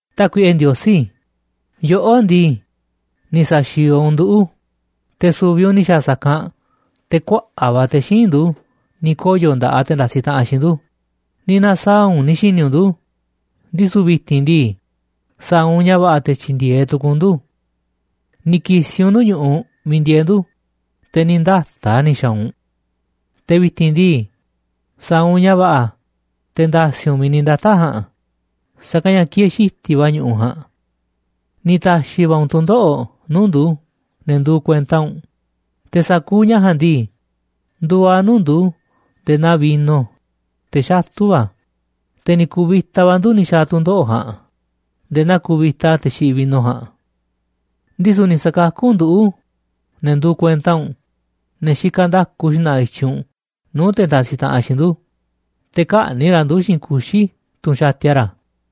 Tákuiꞌe Ndiosí, yoꞌó ndii, ni̱ sa̱xi̱o̱o̱ u̱nꞌ nduꞌu̱, te̱ su̱vi̱ u̱nꞌ ni̱ xa̱a̱ sa̱kanꞌ te̱ kuaꞌa̱ꞌ va̱ te̱ xíinꞌ ndu̱ ni̱ koyo̱ nda̱ꞌaꞌ te̱ ndasiꞌ taꞌanꞌ xiinꞌ ndu̱, ni̱ na̱saa̱ꞌ u̱nꞌ ni̱ xi̱ni̱ u̱nꞌ ndu̱, ndisu̱ vi̱ti̱n ndii, sa̱a̱ u̱nꞌ ña̱ va̱ꞌa̱ te̱ tyi̱ndi̱e̱eꞌ tu̱ku̱u̱ u̱nꞌ ndu̱. Ni̱ ki̱si̱ u̱nꞌ nuu̱ꞌ ñu̱ꞌuꞌ miiꞌ ndieeꞌ ndu̱, te̱ ni̱ ndata̱ꞌ a̱ ni̱ xa̱a̱ u̱nꞌ. Te̱ vi̱ti̱n ndii, sa̱a̱ u̱nꞌ ña̱ va̱ꞌa̱ te̱ nda̱si̱ u̱nꞌ miiꞌ ni̱ ndata̱ꞌ a̱ ja̱a̱nꞌ, sa̱kanꞌ ña̱ kieeꞌ xiti̱ꞌ va̱ ñu̱ꞌuꞌ ja̱a̱nꞌ. Ni̱ ta̱xi̱ va̱ u̱nꞌ tu̱ndoꞌo̱ꞌ nuu̱ꞌ ndu̱, ne̱ nduuꞌ kuenta u̱nꞌ, te̱ sa̱kuuꞌ ña̱ ja̱a̱nꞌ ndii, nduuꞌ a̱ nuu̱ꞌ ndu̱ nde̱e̱ naa vino, te̱ xatu̱ va̱, te̱ ni̱ ku̱vi̱ta va̱ ndu̱ ni̱ xa̱a̱ tu̱ndoꞌo̱ꞌ ja̱a̱nꞌ nde̱e̱ naa kuvita te̱ xiꞌiꞌ vino ja̱a̱nꞌ. Ndisu̱ ni̱ sa̱kakú u̱nꞌ nduꞌu̱, ne̱ nduuꞌ kuenta u̱nꞌ, ne̱ xikaꞌ nda̱ku xna̱ꞌa̱ i̱tyiꞌ u̱nꞌ nuu̱ꞌ te̱ ndasiꞌ taꞌanꞌ xiinꞌ ndu̱, te̱ kä̱ꞌni̱ꞌ ra̱ ndu̱ xiinꞌ kuxi̱, tunꞌ xatia ra̱.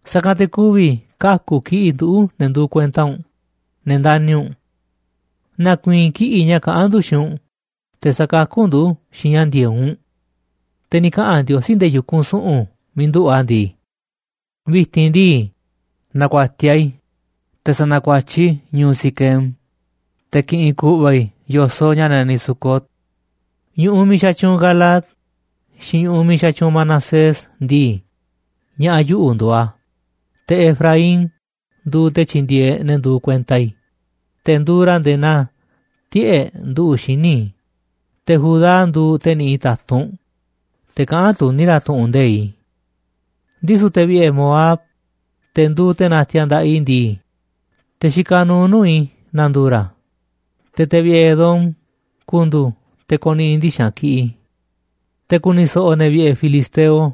Sa̱kanꞌ te̱ ku̱vi̱ kaku̱ kiꞌi̱ꞌ nduꞌu̱, ne̱ nduuꞌ kuenta u̱nꞌ, ne̱ ndani̱ u̱nꞌ. Na̱ku̱i̱i̱n kiꞌi̱ꞌ ña̱ kaꞌán ndu̱ xiinꞌ u̱nꞌ, te̱ sa̱kakú u̱nꞌ ndu̱ xiinꞌ ña̱ ndi̱e̱eꞌ u̱nꞌ. Te̱ ni̱ kaꞌa̱n Ndiosí nde̱e̱ yu̱kunꞌ su̱ꞌu̱n miiꞌ nduꞌu̱ꞌ a̱ ndii: “Vi̱ti̱n ndii, na̱ku̱a̱tiaꞌ i̱, te̱ sa̱na̱kuatyiꞌ i̱ ñu̱u̱ Siquem, te̱ ki̱ꞌi̱n ku̱ꞌva̱ i̱ yo̱soꞌ ña̱ naniꞌ Sucot. Ñu̱ꞌuꞌ miiꞌ xatyuunꞌ Galaad xiinꞌ ñu̱ꞌuꞌ miiꞌ xatyuunꞌ Manasés ndii, ña̱ꞌa̱ yuꞌu̱ nduuꞌ a̱. Te̱ Efraín nduuꞌ te̱ tyindieeꞌ ne̱ nduuꞌ kuenta i̱, te̱ nduuꞌ ra̱ nde̱e̱ naa tiꞌe̱ꞌ nduꞌu̱ꞌ xíniꞌ i̱, te̱ Judá nduuꞌ te̱ niꞌiꞌ ta̱tunꞌ, te̱ kaꞌán tuní ra̱ tu̱ꞌu̱n nde̱iꞌ i̱. Ndisu̱ te̱ vi̱ꞌe̱ Moab, te̱ nduuꞌ te̱ natiaꞌ nda̱ꞌaꞌ i̱ ndii, te̱ xikaꞌ nuuꞌ nuu̱ꞌ i̱ na̱ndu̱u̱ ra̱, te̱ te̱ vi̱ꞌe̱ Edom ku̱ndu̱u̱ te̱ ko̱ni̱ꞌi̱ ndixa̱nꞌ kiꞌiꞌ i̱. Te̱ ku̱ni̱ so̱ꞌo̱ ne̱ vi̱ꞌe̱ filisteo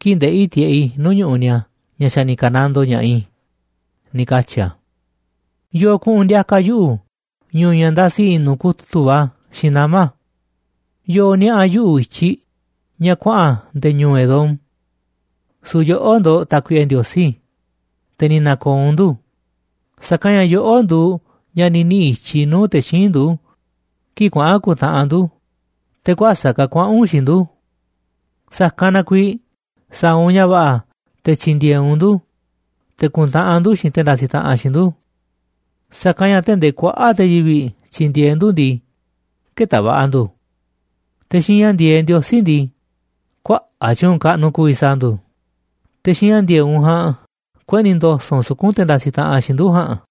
kii̱ꞌ ndeꞌi̱ tiꞌeꞌ i̱ nuu̱ꞌ ñu̱ꞌuꞌ ni̱a̱ ña̱ xa̱ ni̱ ka̱nandoo ña̱ꞌaꞌ i̱”, ni̱ katyi̱ a̱. ¿Yo̱o̱ kuꞌu̱n ndi̱a̱ka̱ yuꞌu̱ ñu̱u̱ ña̱ ndasi i̱ꞌnu̱ kutu̱ꞌ va̱ xiinꞌ nama̱? ¿Yo̱o̱ niaꞌa̱ yuꞌu̱ i̱tyiꞌ ña̱ kuaꞌa̱n nde̱e̱ ñu̱u̱ Edom? Su̱u̱ yoꞌó ndo̱ꞌ, Tákuiꞌe Ndiosí, te̱ ni̱ na̱ko̱o̱ u̱nꞌ ndu̱, sa̱kanꞌ ña̱ yoꞌó nduuꞌ ña̱ ni̱ niꞌi̱ i̱tyiꞌ nuu̱ꞌ te̱ xíinꞌ ndu̱ kii̱ꞌ kuaꞌa̱n ku̱ntaꞌanꞌ ndu̱, te̱ kuäsa̱ꞌ ka̱ kuaꞌa̱n u̱nꞌ xiinꞌ ndu̱. Sa̱kanꞌ na kuiiꞌ sa̱a̱ u̱nꞌ ña̱ va̱ꞌa̱ te̱ tyi̱ndi̱e̱eꞌ u̱nꞌ ndu̱, te̱ ku̱ntaꞌanꞌ ndu̱ xiinꞌ te̱ ndasiꞌ taꞌanꞌ xiinꞌ ndu̱, sa̱kanꞌ ña̱ tee̱ꞌ ndee kuaꞌa̱ꞌ te̱ yivi̱ꞌ tyi̱ndi̱e̱eꞌ ndu̱ ndii, kë̱ta̱ va̱ꞌa̱ ndu̱. Te̱ xiinꞌ ña̱ ndi̱e̱eꞌ Ndiosí ndii, kuaꞌa̱ꞌ tyu̱u̱n kaꞌnuꞌ ku̱vi̱ sa̱a̱ ndu̱, te̱ xiinꞌ ña̱ ndi̱e̱eꞌ u̱nꞌ ja̱a̱nꞌ kueꞌni̱ ndo̱so̱ꞌ u̱nꞌ suku̱nꞌ te̱ ndasiꞌ taꞌanꞌ xiinꞌ ndu̱ ja̱a̱nꞌ.